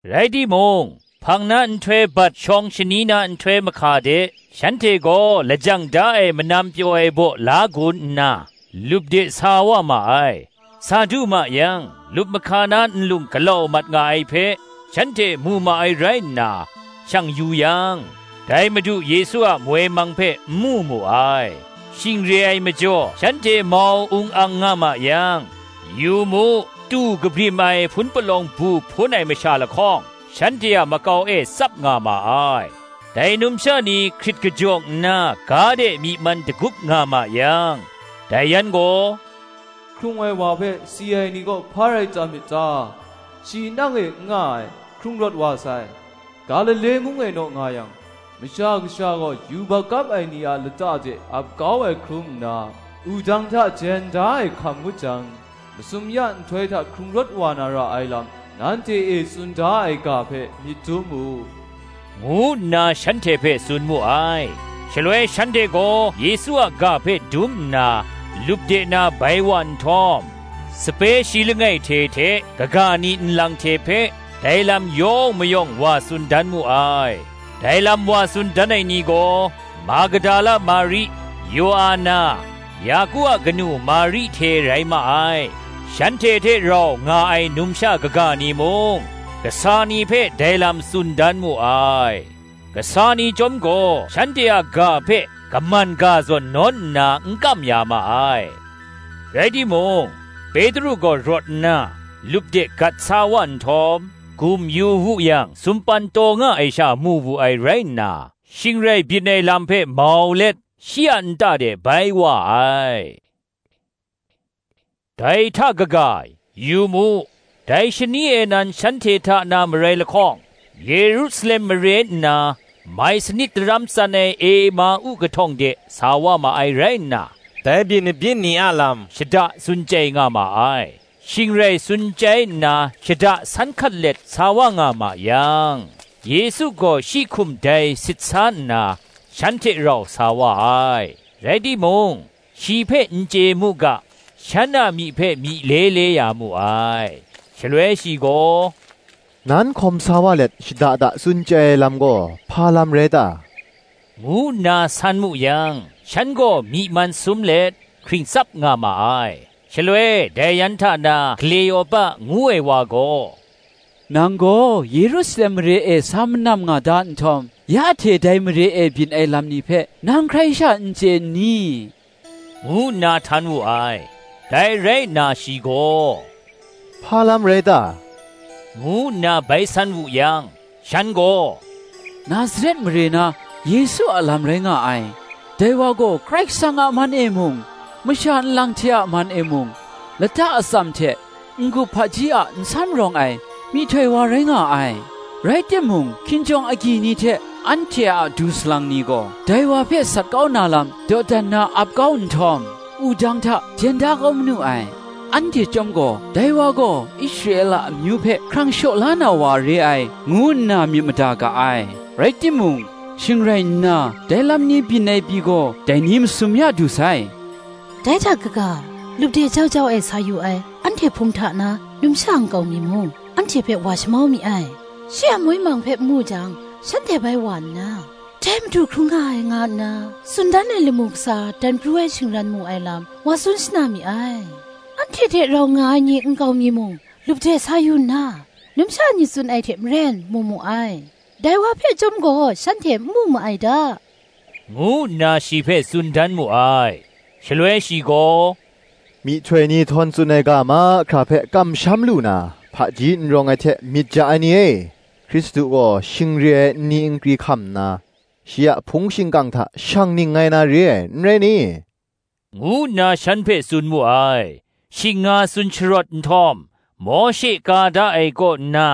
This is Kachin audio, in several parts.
Rai timung, hpang na nhtoi bat shawng shani na nhtoi mahka de, shanhte gaw lajang da ai manam pyaw ai baw la gun nna, lup de sa wa ma ai. Sa du ma yang, lup mahka na nlung galau mat nga ai hpe, shanhte mu ma ai rai nna, shang yu yang, dai Madu Yesu a moi mang hpe n mu mu ai. Shing re ai majaw shanhte mau ung ang nga ma yang, yu mu, tu kabrim ai hpun palawng bu hpun ai masha lahkawng shanhte a makau e tsap nga ma ai. Dai numsha ni hkrit kajawng nna ga de myi man dagup nga ma yang, dai yan gaw, “Hkrung ai wa hpe si ai ni kaw, hpa rai tam myit ta? Shi nang e n nga ai, hkrung rawt wa sai: Galile mung e naw nga yang, Masha Kasha gaw yubak kap ai ni a lata de ap kau ai hkrum nna, wudang hta jen da ai hkam ngut jang, masum ya nhtoi hta hkrung rawt wa na ra ai lam, nanhte e tsun da ai ga hpe myit dum mu,” ngu nna shanhte hpe tsun mu ai. Shaloi shanhte gaw Yesu a ga hpe dum nna, lup de na bai wa nhtawm, sape shi langai hte hte kaga ni nlang hte hpe, dai lam yawng mayawng wa tsun dan mu ai. Dai lam wa tsun dan ai ni gaw, Magdala Mari, Yoana, Yaku a kanu Mari hte rai ma ai; shanhte hte rau nga ai numsha kaga ni mung, kasa ni hpe dai lam tsun dan mu ai. Kasa ni chyawm gaw shanhte a ga hpe kaman ga zawn nawn nna n kam ya ma ai. (Rai timung, Petru gaw rawt nna, lup de gat sa wa nhtawm, gum yu wu yang sumpan taw nga ai sha mu wu ai rai nna, shing rai byin ai lam hpe mau let, shi a nta de bai wa ai.) Dai hta kaga, yu mu, dai shani e nan shanhte hta na marai lahkawng, Yerusalem mare nna, mai sanit daram tsan ai Ema-u kahtawng de sa wa ma ai rai nna, dai byin mabyin ni a lam shada tsun chyai nga ma ai. Shing rai tsun chyai nna shada san hkat let sa wa nga ma yang, Yesu gaw shi hkum dai sit sa nna, shan hte rau sa wa ai. Rai timung, shi hpe n chye mu ga, shan a myi hpe myi le le ya mu ai. Shaloi shi gaw, “Nan hkawm sa wa let, shada da tsun chyai ai lam gaw, hpa lam rai ta?” ngu nna san mu yang, shan gaw myi man sum let, hkring tsap nga ma ai. Shaloi dai yan hta na Hkleopa ngu ai wa gaw, “Nang gaw Yerusalem mare e sa manam nga da nhtawm, ya hte dai mare e byin ai lam ni hpe, nang hkrai sha n chye n ni?” ngu nna htan wu ai. Dai rai nna shi gaw, “Hpa lam rai ta?” ngu nna bai san wu yang, shan gaw, “Nazaret mare na Yesu a lam rai nga ai: dai wa gaw Karai Kasang a man e mung, masha nlang hte a man e mung, lata atsam hte n-gup hpaji a nsam rawng ai myihtoi wa rai nga ai: rai timung hkinjawng agyi ni hte anhte a du salang ni gaw, dai wa hpe sat kau na lam dawdan na ap kau nhtawm, wudang hta jen da kau manu ai. Anhte chyawm gaw, dai wa gaw Israela amyu hpe hkrang shaw la na wa re ai, ngu nna myit mada ga ai: rai timung, shing rai nna dai lam ni byin ai pyi gaw, dai ni masum ya du sai. Dai hta kaga, lup de jau jau e sa yu ai, anhte hpung hta na numsha nkau mi mung, anhte hpe wa shamau mi ai: shi a moi mang hpe n mu jang, shanhte bai wa nna, dai Madu hkrung nga ai, nga nna tsun dan ai lamu kasa dan pru ai shingran mu ai lam, wa tsun shana mi ai. Anhte hte rau nga ai ni nkau mi mung, lup de sa yu nna, numsha ni tsun ai hte maren mu mu ai: dai wa hpe chyawm gaw shanhte n mu ma ai da,” ngu nna shi hpe tsun dan mu ai. Shaloi shi gaw, “Myihtoi ni htawn tsun ai ga mahkra hpe kamsham lu na, hpaji n rawng ai hte myit ja ai ni e! Hkristu gaw shing re ai nni nkri hkam nna, shi a hpung shingkang hta shang ningngai na re ai, n rai ni?” ngu nna shan hpe tsun mu ai. Shing nga tsun sharawt nhtawm, Mawshe ka da ai kaw nna,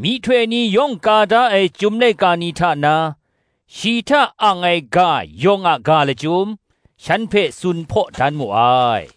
myihtoi ni yawng ka da ai Chyum laika ni hta na, shi hta ang ai ga yawng a ga lachyum, shan hpe tsun hpaw dan mu ai.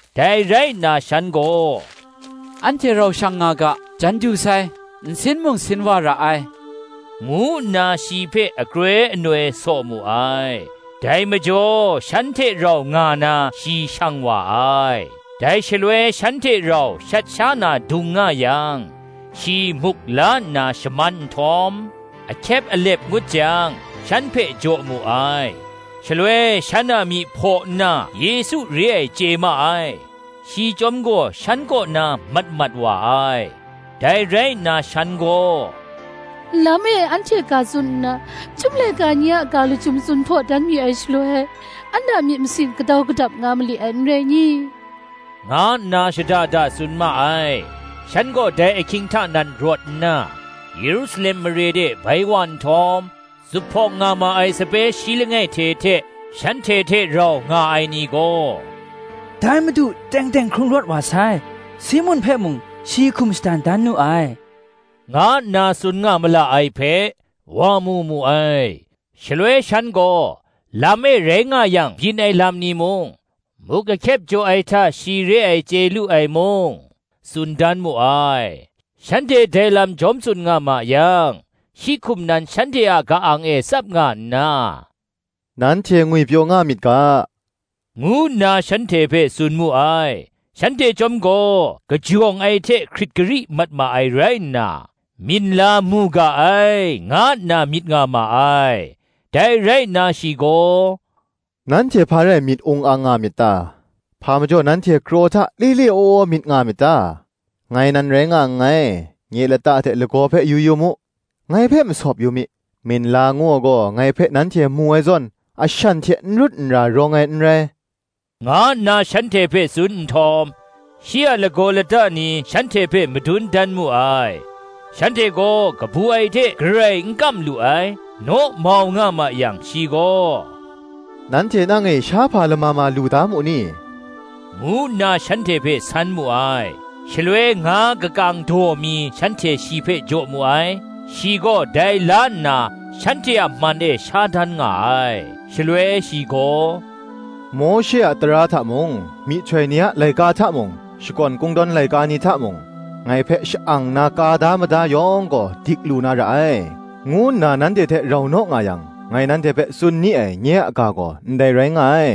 Dai rai nna shan gaw, “Anhte rau shang nga ga: jan du sai, nsin mung sin wa ra ai,” ngu nna shi hpe akroi anoi saw mu ai: dai majaw shan hte rau nga na shi shang wa ai. Dai shaloi shan hte rau shat sha na dung nga yang, shi muk la nna shaman nhtawm, ahkyep alep ngut jang shan hpe jaw mu ai. Shaloi shan a myi hpaw nna Yesu re ai chye ma ai: shi chyawm gaw shan kaw na mat mat wa ai. Dai rai nna shan gaw, Lam e anhte ga tsun nna, Chyum laika ni a ga lachyum tsun hpaw dan mi ai shaloi, an a myit masin gadau gadap nga mali ai, n rai ni?” nga nna shada da tsun ma ai. Shan gaw dai ahkying hta nan rawt nna, Yerusalem mare de bai wa nhtawm, zuphpawng nga ma ai sape shi langai hte hte, shanhte hte rau nga ai ni gaw, ‘Dai Madu teng teng hkrung rawt wa sai; Simun hpe mung shi hkum shadan dan nu ai,’ nga nna tsun nga ma la ai hpe, wa mu mu ai. Shaloi shan gaw, lam e rai nga yang byin ai lam ni mung, muk ahkyep jaw ai hta shi re ai chye lu ai mung, tsun dan mu ai. Shanhte dai lam jawm tsun nga ma yang, shi hkum nan shanhte a ka-ang e tsap nga nna, “Nanhte ngwipyaw nga myit ga,” ngu nna shanhte hpe tsun mu ai. Shanhte chyawm gaw kajawng ai hte hkrit gari mat ma ai rai nna, minla mu ga ai, nga nna myit nga ma ai. Dai rai nna shi gaw, “Nanhte hpa rai myit ung ang nga myit ta? hpa majaw nanhte kraw hta le le waw waw myit nga myit ta? Ngai nan rai nga nngai, nye lata hte lagaw hpe yu yu mu: ngai hpe masawp yu mi; minla ngu ai gaw, ngai hpe nanhte mu ai zawn, ashan hte nrut nra rawng ai n rai,” nga nna shanhte hpe tsun nhtawm, shi a lagaw lata ni shanhte hpe madun dan mu ai. Shanhte gaw kabu ai hte garai n kam lu ai, naw mau nga ma yang, shi gaw, “Nanhte nang e shahpa lama ma lu da mu ni?” ngu nna shanhte hpe san mu ai. Shaloi nga kakang daw mi shanhte shi hpe jaw mu ai. Shi gaw dai la nna, shanhte a man e sha dan nga ai. Shaloi shi gaw, “Mawshe a tara hta mung, myihtoi ni a laika hta mung, Shakawn Kungdawn laika ni hta mung, ngai hpe sha-ang nna ka da mada yawng gaw dik lu na ra ai, ngu nna nanhte hte rau naw nga yang, ngai nanhte hpe tsun ni ai, nye a ga gaw, ndai rai nga ai,”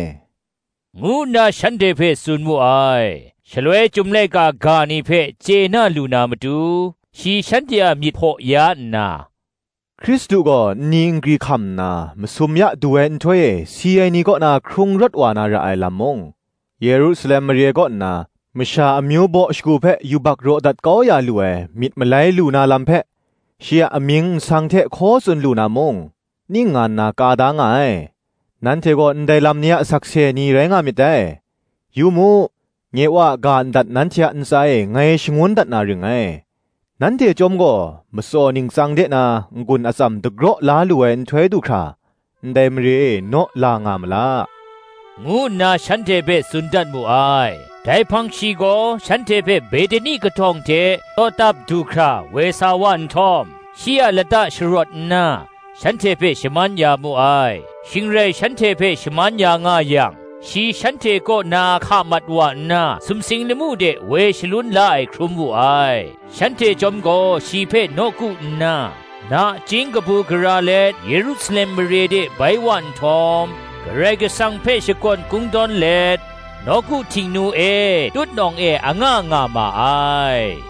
ngu nna shanhte hpe tsun mu ai. Shaloi Chyum laika ga ni hpe chye na lu na matu, shi shanhte a myit hpaw ya nna, “Hkristu gaw nni nkri hkam nna, masum ya du ai nhtoi e si ai ni kaw na hkrung rawt wa na ra ai lam mung, Yerusalem mare kaw nna, masha amyu baw shagu hpe yubak raw dat kau ya lu ai myit malai lu na lam hpe, shi a amying nsang hte hkaw tsun lu na mung, ning nga nna ka da nga ai. Nanhte gaw ndai lam ni a sakse ni rai nga myit dai. Yu mu, nye Wa a ga ndat nanhte a ntsa e ngai shangun dat na ring ngai: nanhte chyawm gaw, matsaw ningtsang de na n-gun atsam dagraw la lu ai nhtoi du hkra, ndai mare e naw la nga ma la,” ngu nna shanhte hpe tsun dat mu ai. Dai hpang shi gaw shanhte hpe Behtani kahtawng hte tawtap du hkra woi sa wa nhtawm, shi a lata sharawt nna, shanhte hpe shaman ya mu ai. Shing rai shanhte hpe shaman ya nga yang, shi shanhte kaw na hka mat wa nna sumsing lamu de woi shalun la ai hkrum wu ai. Shanhte chyawm gaw shi hpe nawku nna, nachying kabu gara let Yerusalem mare de bai wa nhtawm, Karai Kasang hpe shakawn kungdawn let, nawku Htingnu e tutnawng e anga nga ma ai.